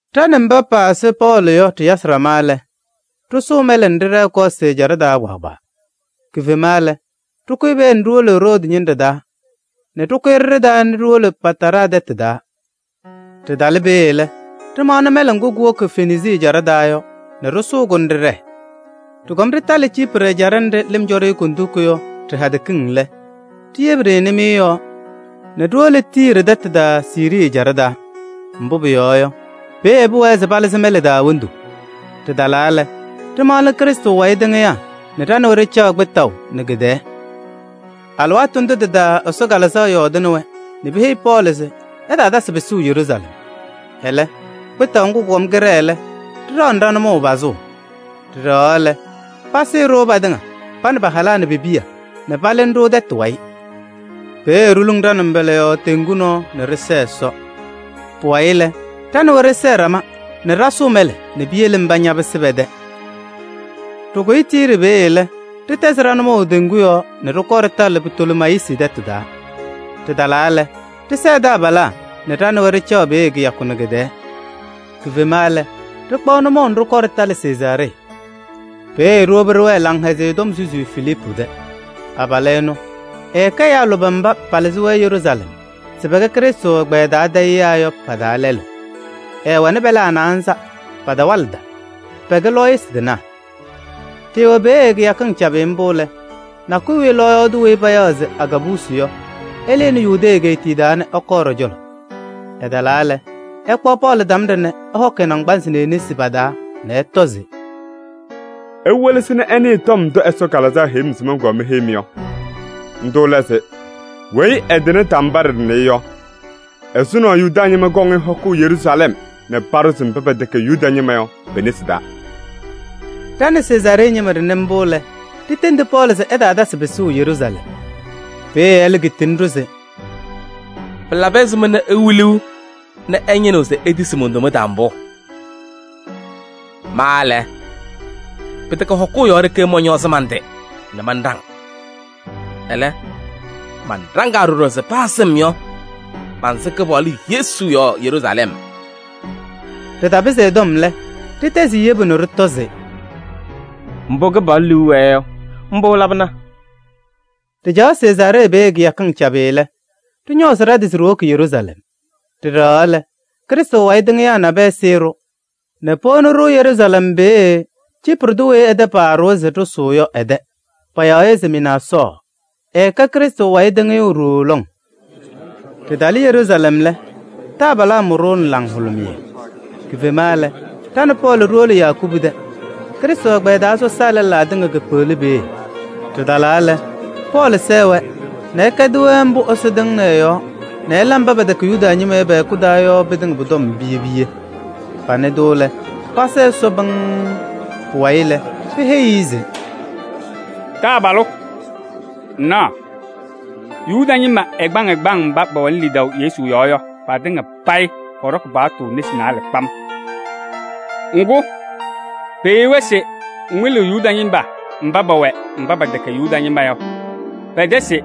Ɖa nɛ mba pasɩ Pɔɔlɩ yɔ ɖɩyasɩ ɖama lɛ, ɖɩsʋʋ mɛlɛ nɛ ɖɩɖɛɛ Kɔɔsɩ ɛjaɖɛ taa kpaagbaa. Kifema lɛ, ɖɩkʋyɩ peeye nɛ ɖiwolo Roodi ñɩnɖɛ taa nɛ ɖɩkʋyɩ ɖɩɖɩ taa nɛ ɖiwolo Pataraa tɛtʋ taa. Ɖɩtalɩ peeye lɛ, ɖɩmaɣnɩ mɛlɛ ŋgʋ kuwoki Fenisii ɛjaɖɛ taa yɔ nɛ ɖɩsʋʋ-kʋ nɛ ɖɩɖɛɛ. Ɖɩkɔm ɖɩtalɩ Ciiprɩ ɛjaɖɛ nɖɩ lɩm cɔ-ɖɩ Kondiko yɔ ɖɩ-hadɛ kiŋ lɛ, ɖiyebi-ɖɩ nɩmɩyɛ yɔɔ nɛ ɖiwolo Tiiri tɛtʋ taa Siirii ɛjaɖɛ taa. Mbʋ pʋyɔɔ yɔ, peeye pʋwɛɛ se palɩzɩ mɛlɛ taa wondu. Ɖɩtalaa lɛ, ɖɩmaɣnɩ Krɩstʋ wayɩ tɩŋɩyaa nɛ ɖa nɛ wɛ ɖɩcaɣ kpɩtaʋ nɛ kɩ-tɛɛ. Alɩwaatʋ ndʋ tɩ-taa Ɛsɔ Kalɩzaɣ yɔɔdɩnɩ-wɛ nɛ peheyi Pɔɔlɩ se ɛtaatasɩ pɩsʋʋ Yeruusalɛm. Ɛlɛ, kpɩtaʋ ŋgʋ kʋkɔm kɩɖɛɛ lɛ, ɖɩɖaɣnɩ ɖa-nʋmɔʋ pazʋʋ. Ɖɩɖɛɣaɣ lɛ, pasɩɩ-ɖʋ patɩŋa, pa nɛ pa-halaa nɛ pe-piya nɛ palɩnɩ-ɖʋ tɛtʋ wayɩ. Peeye ɖiluŋ ɖa-nʋmbɔla yɔɔ teŋgu nɔɔ nɛ ɖɩsɛɛ Ɛsɔ. Pʋwayɩ lɛ, ɖa nɛ wɛ ɖɩsɛɛ ɖama nɛ ɖa ɖasʋʋ mɛlɛ nɛ piyele mba ñapɩsɩ pɛ-tɛ. Ɖɩkʋyɩ Tiiri peeye lɛ, ɖɩtɛzɩ ɖa-nʋmɔʋ teŋgu yɔɔ nɛ ɖɩkɔɔ ɖɩtalɩ Pitolemayisi tɛtʋ taa. Ɖɩtalaa lɛ, ɖɩsɛɛ taabalaa nɛ ɖa nɛ wɛ ɖɩcaɣ kɩyakʋ nɛ kɩ-tɛɛ. Kifema lɛ, ɖɩkpaɣ nʋmɔʋ nɛ ɖɩkɔɔ ɖɩtalɩ Sezaaree. Peeye ɖiwobi ɖɩwɛɛ Laŋhɛzɩyɛ Tɔm susiyu Filiipu tɛ. Abalʋ ɛnʋ, ɛɛkɛ ɛyaa lʋbɛ mba palɩzɩ Yeruusalɛm se pɛkɛ Krɩstʋ ɛgbɛyɛ taa tayɩyaa yɔ pa-taa lɛlʋ. Ɛɛwɛnɩ pɛlaa naanza, patawalɩda, pɛkɛ lɔɔyɩsɩ tɩnaa. Ɖɩɩwɛ peeye kɩyakɩŋ cabɩ mbʋ lɛ, nakʋyʋ wiye lɔɔyaɣ tʋ weyi payaɣ se Agaabusi yɔ, ɛlɩnɩ Yudee egeetiye taa nɛ ɛkɔɔ ɖɔ-cɔlɔ. Ɛtalaa lɛ, ɛkpaɣ Pɔɔlɩ tambaɖɛ nɛ ɛhɔkɩ ɛ-naŋgbanzɩ nɛ e-nesi pa-taa nɛ ɛtɔ se: “Iwelesi nɛ ɩnɩɩ ndʋ Ɛsɔ Kalɩzaɣ tiyi-m se mɔnkɔɔ meheyi-mɩ yɔ. Ndʋ lɛ se: weyi ɛtɩnɩ tambaɖɛ ɖɩnɛ yɔ, ɛzʋnɔ Yuda ñɩma kɔŋ-ɩ hɔkʋʋ Yeruusalɛm nɛ paɖʋzɩ-ɩ mba pɛtɛkɛ Yuda ñɩma yɔ pe-nesi taa.” Ɖa nɛ Sezaaree ñɩma ɖɩnɩ mbʋ lɛ, ɖitendi Pɔɔlɩ se ɛtaatasɩ pɩsʋʋ Yeruusalɛm. Peeye ɛlɛ kitini-ɖʋ se: “Pɩlabɩ ɛzɩma nɛ iwiliɣ nɛ ɩñɩnɩɣ se itisi mon-toma taa mbʋ? Ma lɛ, pɩtɛkɛ hɔkʋʋ yɔɔ ɖeke mɔñɔɔzɩ man-tɩ nɛ manɖaŋ. Ɛlɛ, manɖaŋaa ɖɔɖɔ se paa sɩm yɔ, mansɩ Kɩpaɣlʋ Yesu yɔɔ Yeruusalɛm.” Ɖɩtapɩzɩ ɛ-tɔm lɛ, ɖɩtɛzɩ-ɩ yebu nɛ ɖɩtɔ se: “Mbʋ Kɩpaɣlʋ liu wɛɛ yɔ, mbʋ ɛlabɩna!” Ɖɩcaɣ Sezaaree peeye kɩyakɩŋ cabɩ lɛ, ɖɩñɔɔzɩ ɖa-tɩ se ɖiwoki Yeruusalɛm. Ɖɩɖɛɣaɣ lɛ, Krɩstʋ wayɩ tɩŋɩyaa nabɛyɛ sɩɩ-ɖʋ nɛ powoni-ɖʋ Yeruusalɛm peeye Ciiprɩ tʋ weyi ɛ-tɛ paaɖʋwa se ɖɩsʋʋ yɔ ɛ-tɛ. Payaɣ-ɩ se Mɩnaasɔɔ, ɛkɛ Krɩstʋ wayɩ tɩŋɩyʋ ɖooo lɔŋ. Ɖɩtalɩ Yeruusalɛm lɛ, taabalaa mʋ-ɖʋ nɛ laŋhʋlʋmɩyɛ. Kifema lɛ, ɖa nɛ Pɔɔlɩ ɖiwolo Yakubu tɛ. Krɩstʋ ɛgbɛyɛ taa sɔsaa lɛlaa tɩŋa kekpeɣli peeye. Ɖɩtalaa lɛ, Pɔɔlɩ sɛɛ-wɛ nɛ ɛkɛdɩ-wɛ mbʋ Ɛsɔ tɩŋnɩ ɛ-yɔɔ nɛ ɛla mba pɛtɛkɛ Yuda ñɩma yɔ pɛ-hɛkʋ taa yɔ pɩtɩŋa pʋ-tɔm piye piye. Panɩ-tʋ lɛ, pasa Ɛsɔ pɩŋŋ. Pʋwayɩ lɛ, peheyi-i se: “Taabalʋ! Ŋnaɣ, Yuda ñɩma ɛgbaŋ ɛgbaŋ mba pɛwɛnɩ lidaʋ Yesu yɔɔ yɔ, patɩŋa payɩ pɔɖɔkɩ paɣtʋ nesi naalɛ kpam. Ŋgʋ, peheyi-wɛ se ŋwɩlɩɣ Yuda ñɩma mba pɛwɛ mba pɛtɛkɛ Yuda ñɩma yɔ pɛ-tɛ se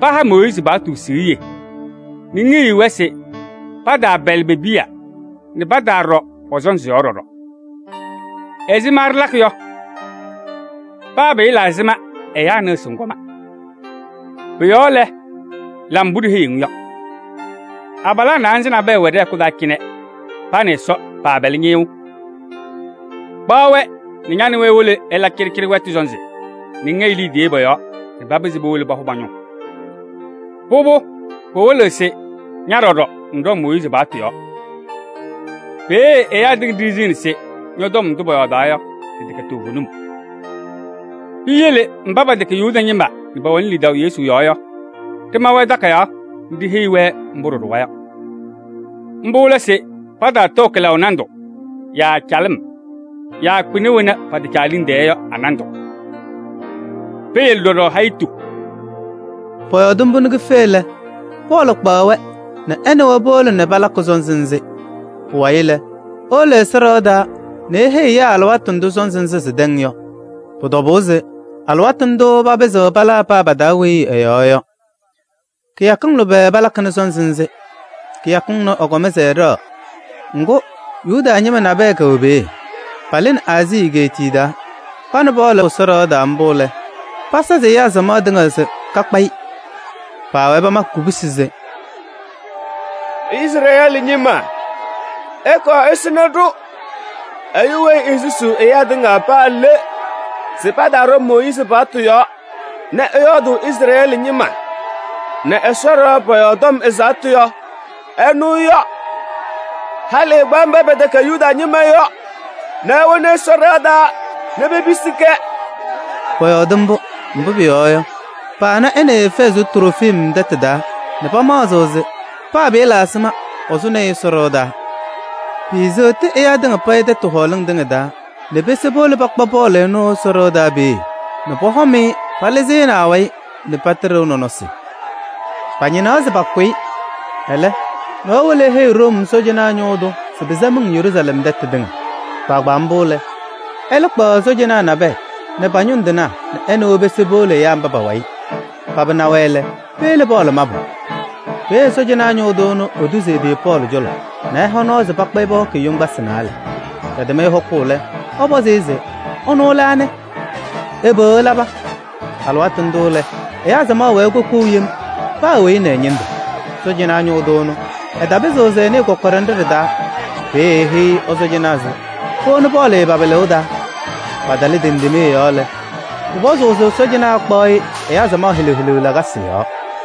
paha Mooyiizi paɣtʋ siɣye nɛ ŋheyiɣ-wɛ se pataapɛlɩ pe-piya nɛ pataaɖɔ pɔ-sɔnzɩ yɔɔ ɖɔɖɔ. Ɛzɩma ɖɩlakɩ yɔ? Paa pɩɩla ɛzɩma ɛyaa nɩɣ se ŋkɔma. Pʋ-yɔɔ lɛ, la mbʋ ɖiheyiɣ-ŋ yɔ. Abalaa naanza nabɛyɛ wɛ ɖɛ-hɛkʋ taa cɩnɛ, pa nɛ Ɛsɔ paapɛlɩ ñɩyʋʋ. Kpaɣ-wɛ nɛ ña nɛ wɛ iwolo ɩla cɩɖɩcɩɖɩ wɛtʋ sɔnzɩ nɛ ŋhɛyɩ liidiye pɔ-yɔɔ nɛ papɩzɩ powolo pahʋ pa-ñʋŋ. Pʋbʋ, pɩwɩlɩɣ se ña ɖɔɖɔ ŋɖɔŋ Mooyiizi paɣtʋ yɔɔ. Peeye ɛyaa tɩŋa ɖiɣziɣni se ñɔ-tɔm ndʋ pɔyɔɔdaɣ yɔ, tɩtɛkɛ toovenim. Piyele mba pɛtɛkɛ Yuda ñɩma nɛ pɛwɛnɩ lidaʋ Yesu yɔɔ yɔ, ɖɩma-wɛ takayaɣ nɛ ɖiheyi-wɛ mbʋ ɖɩɖʋwa yɔ. Mbʋ lɛ se pataatɔɔ kɩlaʋ nandʋ yaa calɩm yaa kpɩna wena pɛtɛcɛ a-liŋ tɛɛ yɔ a-nandʋ. Peyele ɖɔɖɔ hayitu.” Pɔyɔɔdɩ mbʋ nɛ kife lɛ, Pɔɔlɩ kpaɣ-wɛ nɛ ɛ nɛ wɛ powolo nɛ palakɩ sɔnzɩ nzɩ. Pʋwayɩ lɛ, ewolo Ɛsɔ ɖɩɣa taa nɛ eheyi ɛyaa alɩwaatʋ ndʋ sɔnzɩ nzɩ sɩtɛŋ yɔ. Pʋ-tɔbʋʋ se alɩwaatʋ ndʋ papɩzɩɣ palaa paa pa-taa weyi ɛ-yɔɔ yɔ. Kɩyakɩŋ lʋbɛ palakɩnɩ sɔnzɩ nzɩ. Kɩyakɩŋ ɩnʋ ɩkɔm se ɩɖɛɣ, ŋgʋ, Yuda ñɩma nabɛyɛ kɛwɛ peeye. Palɩnɩ Aazii egeetiye taa. Pana Pɔɔlɩ Ɛsɔ ɖɩɣa taa mbʋ lɛ, pasazɩ ɛyaa samaɣ tɩŋa se kakpa-ɩ. Paawɛɛ pamakɩ kubusi se: “Izrɛɛlɩ ñɩma, ɩkɔɔ ɩsɩnɩ-ɖʋ! Ɛyʋ weyi esusuu ɛyaa tɩŋa paa le se pataaɖɔ Mooyiizi paɣtʋ yɔɔ nɛ ɛyɔɔdʋʋ Izrɛɛlɩ ñɩma nɛ Ɛsɔ ɖɩɣa pɔ-yɔɔ tɔm ɛzaɣtʋ yɔ, ɛnʋ yɔ. Halɩ ɛkpaɣ mba pɛtɛkɛ Yuda ñɩma yɔ nɛ ewoni Ɛsɔ ɖɩɣa taa nɛ pepisi-kɛ!” Pɔyɔɔdɩ mbʋ, mbʋ pʋyɔɔ yɔ, paana ɛ nɛ Efɛɛzɩ tʋ Trofim tɛtʋ taa nɛ pamaɣzɩ se paa pɩɩla ɛzɩma, ɛsʋnɩ-ɩ Ɛsɔ ɖɩɣa taa. Piiseɣti ɛyaa tɩŋa payɩ tɛtʋ hɔɔlɩŋ tɩŋa taa nɛ pese powolo pakpa Pɔɔlɩ ɛnʋ Ɛsɔ ɖɩɣa taa peeye nɛ pɔhɔm-ɩ palɩzɩnɩ awayɩ nɛ patɩɖɩʋ nɔnɔsɩ. Pañɩnaɣ se pakʋ-ɩ. Ɛlɛ, nɔɔyʋ wolo eheyi Room sɔɔjanaa ñʋʋ tʋ se pɩsa miŋ Yeruusalɛm tɛtʋ tɩŋa. Kpaagbaa mbʋ lɛ, ɛlɛ kpaɣ ɛ-sɔɔjanaa nabɛyɛ nɛ paba ñʋŋ tɩnaa nɛ ɛ nɛ wɛ pese powolo ɛyaa mba pa-wayɩ. Paba na-wɛ lɛ, peyele Pɔɔlɩ mabʋ. Peeye sɔɔjanaa ñʋʋ tʋ ɛnʋ etuzi ɛ-tɩ Pɔɔlɩ cɔlɔ nɛ ɛha nɔɔ se pakpa-ɩ pɔhɔkɩ-ɩ yoŋgbasɩ naalɛ. Pɛtɛm-ɩ hɔkʋʋ lɛ, ɛpɔzɩ se: ɛnʋ lɛ anɩ? Ɛbɛ ɛlaba? Alɩwaatʋ ndʋ lɛ, ɛyaa samaɣ wɛɛ kokou yem: paa weyi nɛ ɛ-ñɩndʋ. Sɔɔjanaa ñʋʋ tʋ ɛnʋ, ɛtapɩzɩɣ se ɛnɩɩ kɔkɔɖɛ nɖɩ ɖɩ-taa. Peeye eheyi ɛ-sɔɔjanaa se powoni Pɔɔlɩ pa-pɩlɩʋ taa. Patalɩ tendemee yɔɔ lɛ, pʋpɔzɩ se sɔɔjanaa ɛkpaɣ-ɩ ɛyaa samaɣ helu helu lakasɩ yɔɔ.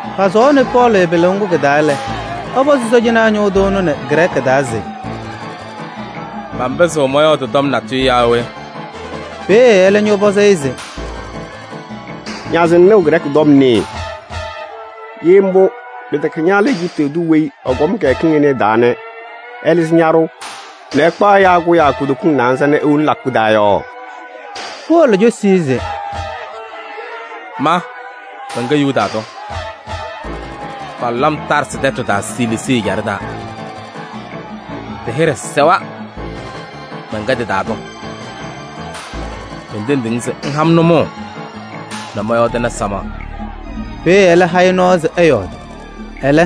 Pasʋwaɣnɩ Pɔɔlɩ pɩlʋʋ ŋgʋ kɩ-taa lɛ, ɛpɔzɩ sɔɔjanaa ñʋʋ tʋ ɛnʋ nɛ Grɛɛkɩ taa se: “Manpɩzɩɣ mɔyɔɔdɩ tɔm natʋyʋ yaa we?” Peeye ɛlɛ ñɔpɔzɩ-ɩ se: “Naze ŋnɩɣ Grɛɛkɩ tɔm nɩɩ? Ye mbʋ, pɩtɛkɛ ña lɛ Ejiptɩ tʋ weyi ɛkɔm kɩyakɩŋ ɩnɛ ɩ-taa nɛ ɛlɩzɩ ñaɖʋʋ nɛ ɛkpaɣ ɛyaa kʋyaa kutokiŋ naanza nɛ ewoni lakʋ taa yɔ?” Pɔɔlɩ cosi-i se: “Ma mɛnkɛ Yuda tʋ, palʋlɩ-m Taarsɩ tɛtʋ taa Siliisii ɛjaɖɛ taa, tɩ-hɩɖɛ sɛwa, mɛnkɛ tɩ-taa tʋ. Mentendiɣ-ŋ se ŋha-m nʋmɔʋ nɛ mɔyɔɔdɩnɩ samaɣ.” Peeye ɛlɛ ha-ɩ nʋmɔʋ se ɛyɔɔdɩ. Ɛlɛ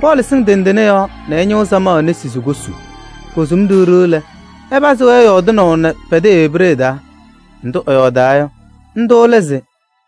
Pɔɔlɩ sɩŋ tendene yɔɔ nɛ ɛñɩɣ samaɣ nesi se kosu. Kosum ɖiɣ ɖiɣ lɛ, ɛpazɩ-wɛ yɔɔdɩnaʋ nɛ pɛ-tɛ Ebree taa. Ndʋ ɛyɔɔdaa yɔ, ndʋ lɛ se: